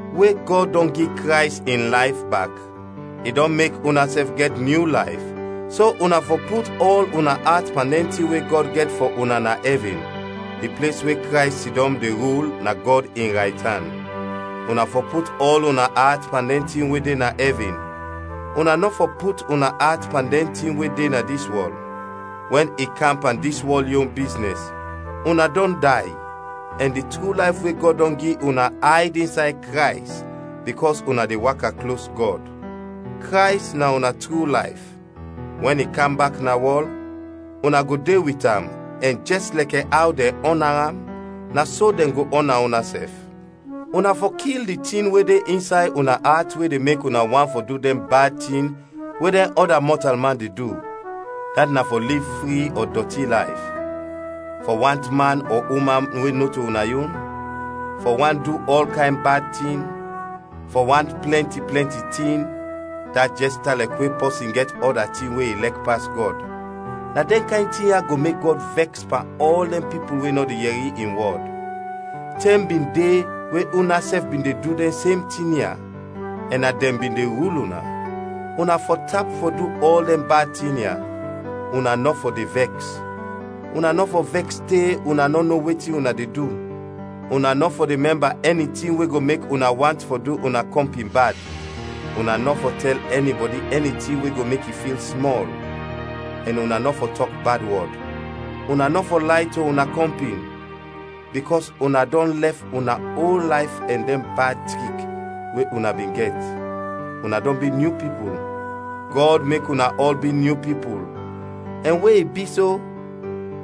We Gɔd dɔn gi Krays in layf bak, i dɔn mek unasɛf gɛt nyu layf, so una fɔ put ɔl una at pan dɛn tin we Gɔd gɛt fɔ una na ɛvin, di ples we Krays sidɔm de rul na Gɔd in raytan. Una fɔ put ɔl una at pan dɛn tin we de na ɛvin, una nɔ fɔ put una at pan dɛn tin we de na dis wɔl. Wɛn i kam pan dis wɔl yon biznɛs, una dɔn day, ɛn di tru layf we Gɔd dɔn gi una ayd insay Krays bikɔs una de waka klos Gɔd. Krays na una tru layf. Wɛn i kam bak na wɔl, una go de wit am ɛn jɛs lɛkɛ aw dɛn ɔna am, na so dɛn go ɔna unasɛf. Una fɔ kil di tin we de insay una at we de mek una want fɔ du dɛn bad tin we dɛn ɔda mɔtalman de du, dat na fɔ liv fri ɔ dɔti layf; fɔ want man ɔ uman we nɔto una yon; fɔ want fɔ du ɔl kayn bad tin; fɔ want plɛnti, plɛnti tin (dat jɛs tan lɛkɛ wɛn pɔsin gɛt ɔda tin we i lɛk pas Gɔd). Na dɛn kayn tin ya go mek Gɔd vɛks pan ɔl dɛn pipul we nɔ de yɛri in wɔd. Tɛm bin de we unasɛf bin de du dɛn sem tin ya, ɛn na dɛn bin de rul una. Una fɔ tap fɔ du ɔl dɛn bad tin ya: una nɔ fɔ de vɛks; una nɔ fɔ vɛks te una nɔ no wetin una de du; una nɔ fɔ de mɛmba ɛni tin we go mek una want fɔ du una kɔmpin bad. Una nɔ fɔ tɛl ɛnibɔdi ɛni tin we go mek i fil smɔl; ɛn una nɔ fɔ tɔk bad wɔd. Una nɔ fɔ lay to una kɔmpin, bikɔs una dɔn lɛf una ol layf ɛn dɛn bad trik we una bin gɛt, una dɔn bi nyu pipul. Gɔd mek una ɔl bi nyu pipul, ɛn we i bi so,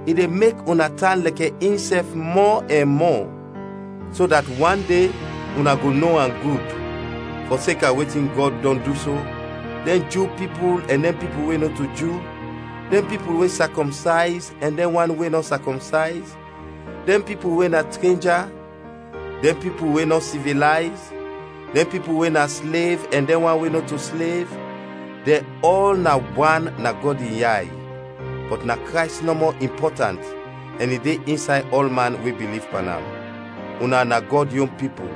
i de mek una tan lɛkɛ insɛf mɔ ɛn mɔ, so dat wan de una go no am gud. Fɔseka wetin Gɔd dɔn du so, dɛn Ju pipul ɛn dɛn pipul we nɔto Ju, dɛn pipul we sakɔmsayz ɛn dɛn wan we nɔ sakɔmsayz, dɛn pipul we na trenja, dɛn pipul we nɔ sivilayz, dɛn pipul we na slev ɛn dɛn wan we nɔto slev, dɛn ɔl na wan na Gɔd in yay, bɔt na Krays nɔmɔ impɔtant ɛn i de insay ɔlman we biliv pan am. Una na Gɔd yon pipul;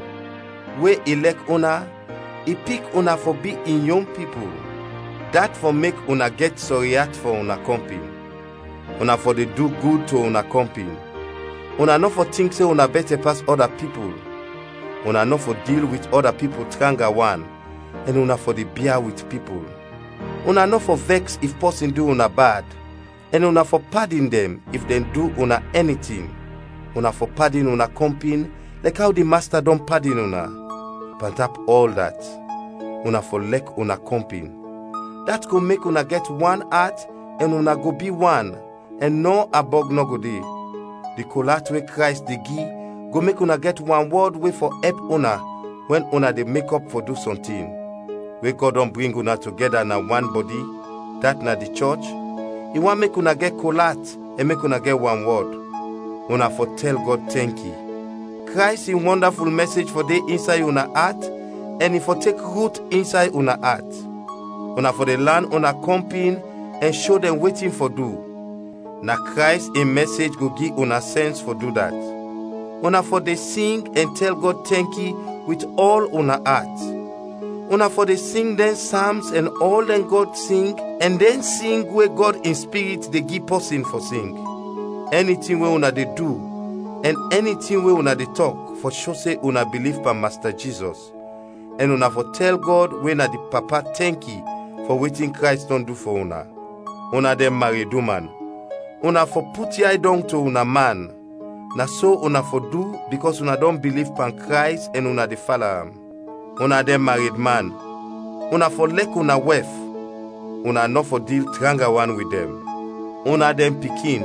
we i lɛk una, i pik una fɔ bi in yon pipul. Dat fɔ mek una gɛt sɔri at fɔ una kɔmpin, una fɔ de du gud to una kɔmpin, una nɔ fɔ tink se una bɛtɛ pas ɔda pipul, una nɔ fɔ dil wit ɔda pipul tranga wan, ɛn una fɔ de bia wit pipul. Una nɔ fɔ vɛks if pɔsin du una bad, ɛn una fɔ padin dɛn if dɛn du una ɛni tin. Una fɔ padin una kɔmpin lɛkɛ aw di Masta dɔn padin una. Pantap ɔl dat, una fɔ lɛk una kɔmpin, dat go mek una gɛt wan at ɛn una go bi wan, ɛn nɔ ambɔg nɔ go de. Di kol at we Krays de gi go mek una gɛt wanwɔd we fɔ ɛp una wɛn una de mekɔp fɔ du sɔntin. We Gɔd dɔn bring una togɛda na wan bɔdi, dat na di chɔch, i want mek una gɛt kol at ɛn mek una gɛt wanwɔd. Una fɔ tɛl Gɔd tɛnki. Krays in wɔndaful mɛsej fɔ de insay una at ɛn i fɔ tek rut insay una at. Una fɔ de lan una kɔmpin ɛn sho dɛn wetin fɔ du, na Krays in mɛsej go gi una sɛns fɔ du dat. Una fɔ de sing ɛn tɛl Gɔd tɛnki wit ɔl una at, una fɔ de sing dɛn Sams ɛn ɔl dɛn Gɔd sing ɛn dɛn sing we Gɔd in Spirit de gi pɔsin fɔ sing. Ɛni tin we una de du ɛn ɛni tin we una de tɔk fɔ sho se una biliv pan Masta Jizɔs, ɛn una fɔ tɛl Gɔd we na di Papa tɛnki fɔ wetin Krays dɔn du fɔ una. Una dɛn mareduman, una fɔ put yay dɔng to una man. Na so una fɔ du bikɔs una dɔn biliv pan Krays ɛn una de fala am. Una dɛn maredman, una fɔ lɛk una wɛf, una nɔ fɔ dil tranga wan wit dɛn. Una dɛn pikin,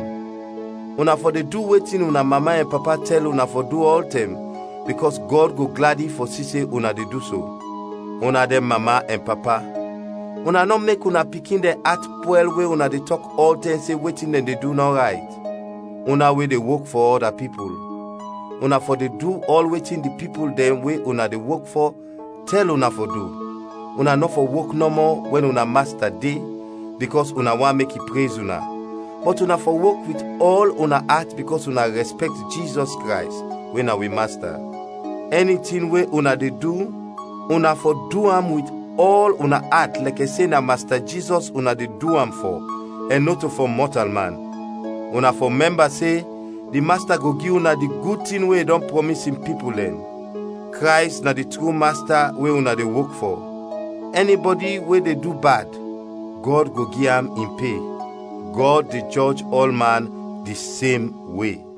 una fɔ de du wetin una mama ɛn papa tɛl una fɔ du ɔltɛm, bikɔs Gɔd go gladi fɔ si se una de du so. Una dɛn mama ɛn papa, una nɔ mek una pikin dɛn at pwɛl we una de tɔk ɔltɛm se wetin dɛn de du nɔ rayt. Una we de wok fɔ ɔda pipul, una fɔ de du ɔl wetin di pipul dɛn we una de wok fɔ tɛl una fɔ du, una nɔ fɔ wok nɔmɔ wɛn una masta de, bikɔs una want mek i prez una, bɔt una fɔ wok wit ɔl una at bikɔs una rɛspɛkt Jizɔs Krays we na wi Masta. Ɛni tin we una de du una fɔ du am wit ɔl una at lɛkɛ se na Masta Jizɔs una de du am fɔ ɛn nɔto fɔ mɔtalman. Una fɔ mɛmba se di Masta go gi una di gud tin we i dɔn prɔmis in pipul dɛn. Krays na di tru Masta we una de wok fɔ. Ɛnibɔdi we de du bad, Gɔd go gi am in pe; Gɔd de jɔj ɔlman di sem we.